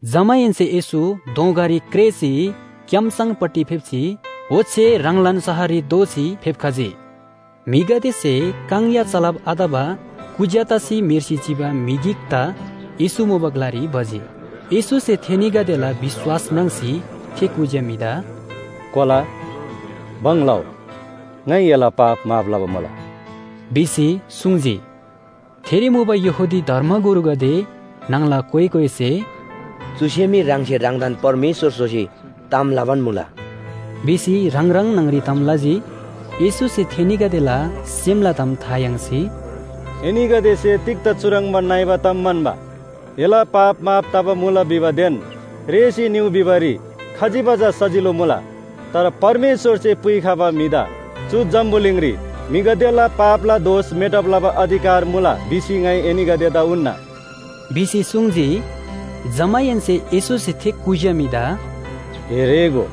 जमाहेन्‍से येशू दोँगारी क्रेःसी क्‍यामसङपट्टि फेप्‍जी, ओच्‍छे ह्राङलान शहररी दोःसी फेप्‍खजी। म्‍हिगदेसे काङ या चलब आतबा कुज्‍या तसी म्‍हेर्सी चिबा म्‍हि गिकदा येशू मुबा ग्‍लारी भजी। येशूसे थेनीगदेला विश्‍वास म्राङ्सी थे कुज्‍या म्‍हिदा “कोला, भङ लउ, ङाइ एला पाप माफ लबा मुला” भिसी सुङ्जी। थेरी मुबा यहूदी धर्मगुरुगदे न्‍हङला कोइ कोइसे “चुसे मी ह्राङसे ह्राङदान परमेश्‍वर स्‍होसी ताम लबान मुला” भिसी ह्राङ ह्राङ न्‍हङरी ताम लजी। येशूसे थेनीगदेला सेमला ताम था याङ्सी “एनीगदेसे तिग्‍दा चुह्रङ्बा नइबा ताम म्‍हन्‍बा? ‘एला पाप माफ तबा मुला’ भिबादेन ‘रेःसी भ्रउ’ भिबारी खजिबा चा सजिलो मुला? तर परमेश्‍वरसे पुइखबा म्‍हिदा चु जम्‍बुलिङरी म्‍हिगदेला पापला दोष मेटब लबा अधिकार मुला भिसी ङाइ एनीगदेदा उन्‍ना” भिसी सुङ्जी। जमाहेन्‍से येशूसे थे कुज्‍या म्‍हिदा “ए रेःगो,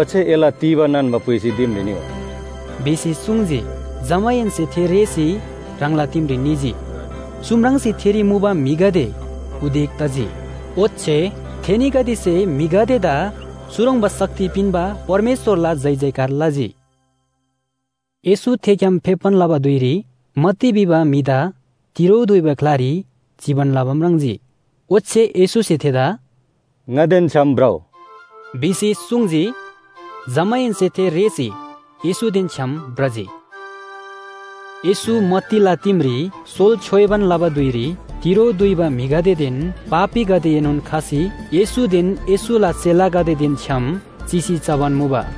ओच्‍छे एला तीबा नान्‍बा पुइसी दिमरी निउ” भिसी सुङ्जी। जमाहेन्‍से थे रेःसी ह्राङला दिमरी निजी। चु म्राङ्सी थेरी मुबा म्‍हिगदे उदेक तजी। ओच्‍छे थेनीगदेसे म्‍हिगदेदा चुह्रङ्बा शक्ति पिन्‍बा परमेश्‍वरला जयजयकार लजी। येशू थेग्‍याम फेप्‍बान लबा धुइरी मत्ती भिबा म्‍हिदा तिरो दुइबा ग्‍लारी चिबान लबा म्राङ्जी, ओच्‍छे येशूसे थेदा “ङादेन छ्‌याम भ्रउ” भिसी सुङ्जी। जमाहेन्‍से थे रेःसी येशूदेन छ्‌याम भ्रजी। येशू मत्तीला दिमरी सोल छ्‌योइबान लबा धुइरी तिरो दुइबा म्‍हिगदेदेन पापीगदेएनोन खसी येशूदेन येशूला चेलागदेदेन छ्‌याम चिसी चबान मुबा।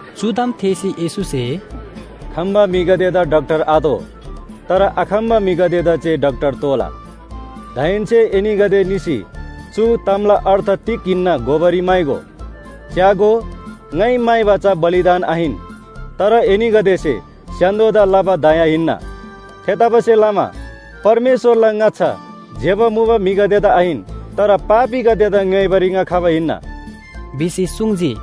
चु ताम थेःसी येशूसे “खम्‍बा म्‍हिगदेदा डाक्‍टर आतोः, तर आखम्‍बा म्‍हिगदेदा जे डाक्‍टर तोःला। दाहेन्‍से एनीगदे निसी चु तामला अर्थ तिग हिन्‍ना घोबारी म्‍हाइगो, ‘च्‍यागो, ङाइ म्‍हाइबा चा बलिदान आहिन, तर एनीगदेसे स्‍य्‍हान्‍दोदा लबा दया हिन्‍ना।’ थेतबासेलमा परमेश्‍वरला ङाच्‍छा ज्‍यबा मुबा म्‍हिगदेदा आहिन, तर पापीगदेदा ङ्‌योइबारी ङा खबा हिन्‍ना” भिसी सुङ्जी।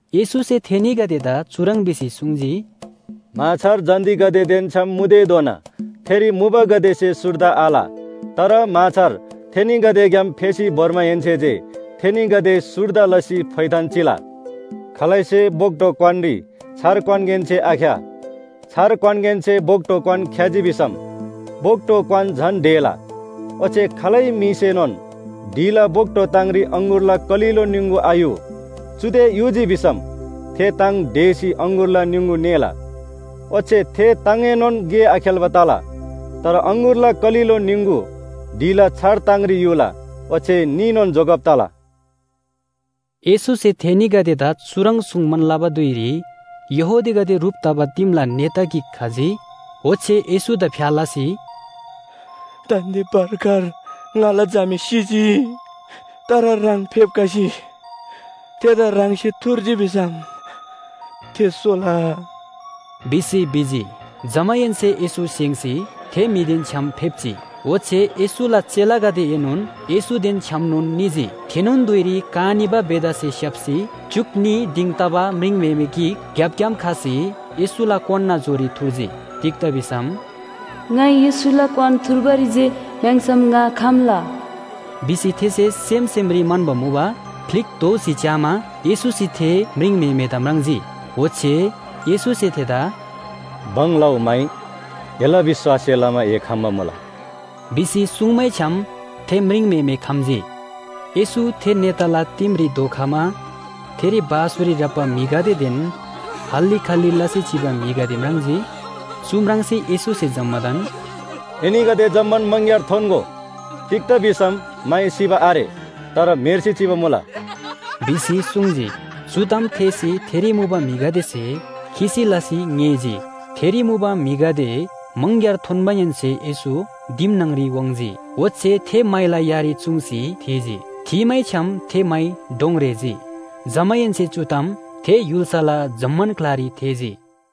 येशूसे थेनीगदेदा चुह्रङ् भिसी सुङ्जी, “म्‍हाछार जन्‍तीगदेदेन छ्‌याम मुतेधोना थेरी मुबागदेसे सुर्दा आल। तर म्‍हाछार थेनीगदेग्‍याम फेसी भोर्माहेन्‍से जे थेनीगदे सुर्दा तसी फोइथान चिला। खालैसे बोक्‍टो क्‍वानरी छार क्‍वानगेनसे आख्‍या, छार क्‍वानगेनसे बोक्‍टो क्‍वान ख्‍याजी भिसम बोक्‍टो क्‍वान झन ढेला। ओच्‍छे खालै म्‍हिसेनोन ढिला बोक्‍टो ताङरी अङगुरला कलिलो निङगु आयु, चुदे युजी भिसम थे ताङ ढेसी अङगुरला निङगु ङेला। ओच्‍छे थे ताङएनोन गे आखेल्‍बा तला। तर अङगुरला कलिलो निङगु ढिला छार ताङरी युला ओच्‍छे न्‍हीनोन जोगब तला।” येशूसे थेनीगदेदा चुह्रङ् सुङ्बान लबा धुइरी यहूदीगदे ह्रुप तबा दिमला नेता गिक खजी। ओच्‍छे येशूदा फ्‍या लसी “दान्‍दे भर्खर ङाला झामे सिजी, तर ह्राङ फेप्‍खसी थेदा ह्राङसे थुर्जी भिसम थे सोला” भिसी भिजी। जमाहेन्‍से येशू स्‍हेङ्‌सी थे म्‍हिदेन छ्‌याम फेप्‍जी, ओच्‍छे येशूला चेलागदेएनोन येशूदेन छ्‌यामनोन निजी। थेनोन धुइरी का निबा बेथासे स्‍याप्‍सी च्‍युक न्‍ही दिङ तबा म्रिङम्‍हेमे गिक ग्‍यापग्‍याम खसी येशूला क्‍वानला जोरी थुर्जी। तिग्‍दा भिसम “ङाइ येशूला क्‍वान थुर्बारी जे म्‍याङ्‍सम ङा खम्‍ला” भिसी थेसे सेम सेमरी म्‍हन्‍बा मुबा। फ्‍लिक दोःसी च्‍यामा येशूसे थे म्रिङम्‍हेमेदा म्राङ्जी। ओच्‍छे येशूसे थेदा “भङ लउ, माइ! एला विश्‍वाससे लमा ए खम्‍बा मुला” भिसी सुङ्मैछ्‌याम थे म्रिङम्‍हेमे खम्‍जी। येशू थे नेताला दिमरी धोखमा थेरी बाँसुरी ह्राप्‍बा म्‍हिगदेदेन हल्‍ली खल्‍ली लसी चिबा म्‍हिगदे म्राङ्जी। चु म्राङ्सी येशूसे जम्‍मादान “एनीगदे जम्‍मान मङग्‍यार थोन्‍गो। तिग्‍दा भिसम माइ सिबा आरे, तर म्‍हेर्सी चिबा मुला” भिसी सुङ्जी। चु ताम थेःसी थेरी मुबा म्‍हिगदेसे खिसी लसी ङेःजी। थेरी मुबा म्‍हिगदे मङग्‍यार थोन्‍माहेन्‍से येशू दिम न्‍हङरी वाङ्‌जी। ओच्‍छे थे माइला यारी चुङ्सी थीजी। थीमैछ्‌याम थे माइ डोङ रेःजी। जमाहेन्‍से चु ताम थे य्‍हुल्‍साला जम्‍मान ग्‍लारी थेःजी।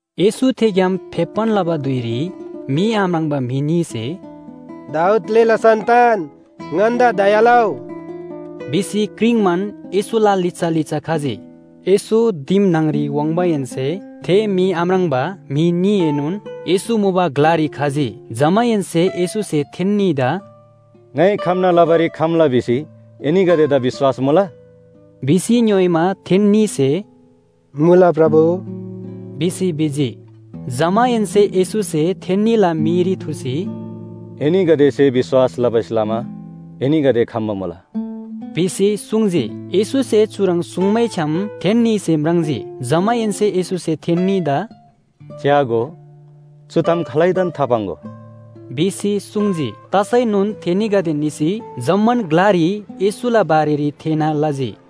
येशू थेग्‍याम फेप्‍बान लबा धुइरी मी आम्राङ्बा म्‍हि न्‍हीसे “दाऊद ग्‍लेला सन्‍तान, ङन्‍दा दया लउ” भिसी क्रिङ्बान येशूला लिच्‍छा लिच्‍छा खजी। येशू दिम न्‍हङरी वाङ्माहेन्‍से थे मी आम्राङ्बा म्‍हि न्‍हीएनोन येशू मुबा ग्‍लारी खजी। जमाहेन्‍से येशूसे थेन्‍नीदा “ङाइ खम्‍ना लबारी खम्‍ला भिसी एनीगदेदा विश्‍वास मुला?” भिसी ङ्‌योइमा थेन्‍नीसे “मुला, प्रभु” भिसी भिजी। जमाहेन्‍से येशूसे थेन्‍नीला मीरी थुर्सी “एनीगदेसे विश्‍वास लबासे लमा एनीगदे खम्‍बा मुला” भिसी सुङ्जी। येशूसे चुह्रङ् सुङ्मैछ्‌याम थेन्‍नीसे म्राङ्जी। जमाहेन्‍से येशूसे थेन्‍नीदा “च्‍यागो, चु ताम खालैदान थापाङ्‍गो” भिसी सुङ्जी। तसैनोन थेनीगदे निसी जम्‍मान ग्‍लारी येशूला बारेरी थेःना लजी।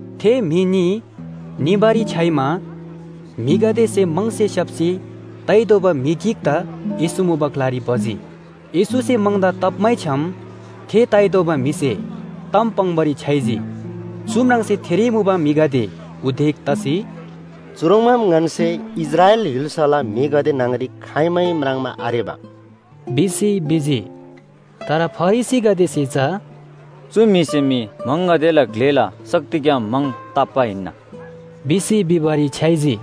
थे म्‍हि न्‍ही निबारी छ्‌याइमा म्‍हिगदेसे म्‍हङसे स्‍याप्‍सी ताइ दोबा म्‍हि गिकदा येशू मुबा ग्‍लारी भजी। येशूसे म्‍हङदा ताप्‍मैछ्‌याम थे ताइ दोबा म्‍हिसे ताम पाङ्‌बारी छ्‌याइजी। चु म्राङ्सी थेरी मुबा म्‍हिगदे उदेक तसी “चुह्रङ्बाम ङन्‍से इस्राएल य्‍हुल्‍साला म्‍हिगदे न्‍हङरी खाइमै म्राङ्बा आरेबा” भिसी भिजी। तर फरिसीगदेसे चा “चु म्‍हिसे मी म्‍हङगदेला ग्‍लेला शक्तिग्‍याम म्‍हङ ताप्‍बा हिन्‍ना” भिसी भिबारी छ्‌याइजी।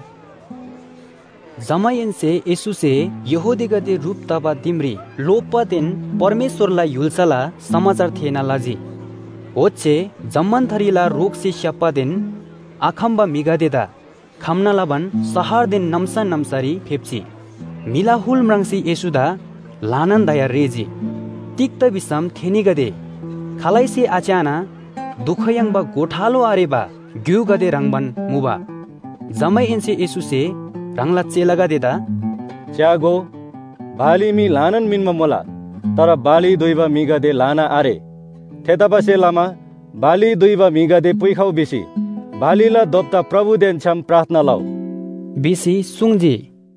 जमाहेन्‍से येशूसे यहूदीगदे ह्रुप तबा दिमरी लोप्‍बादेन परमेश्‍वरला य्‍हुल्‍साला समाचार थेःना लजी। ओच्‍छे जम्‍मान थरीला रोगसे स्‍याप्‍बादेन आखम्‍बा म्‍हिगदेदा खम्‍ना लबान शहरदेन नाम्‍सा नाम्‍सारी फेप्‍जी। म्‍हिला हुल म्राङ्सी येशूदा ल्‍हानान दया रेःजी, तिग्‍दा भिसम थेनीगदे खालैसे आच्‍याना दुख याङ्बा गोठालो आरेबा ग्‍युगदे ह्रङ्‌बान मुबा। जमाहेन्‍से येशूसे ह्राङला चेलागदेदा “च्‍यागो, बाली मी ल्‍हानान मिन्‍बा मुला, तर बाली दुइबा म्‍हिगदे ल्‍हाना आरे। थेतबासेलमा बाली दुइबा म्‍हिगदे पुइखउ भिसी बालीला दोप्‍ता प्रभुदेन छ्‌याम प्रार्थना लउ” भिसी सुङ्जी।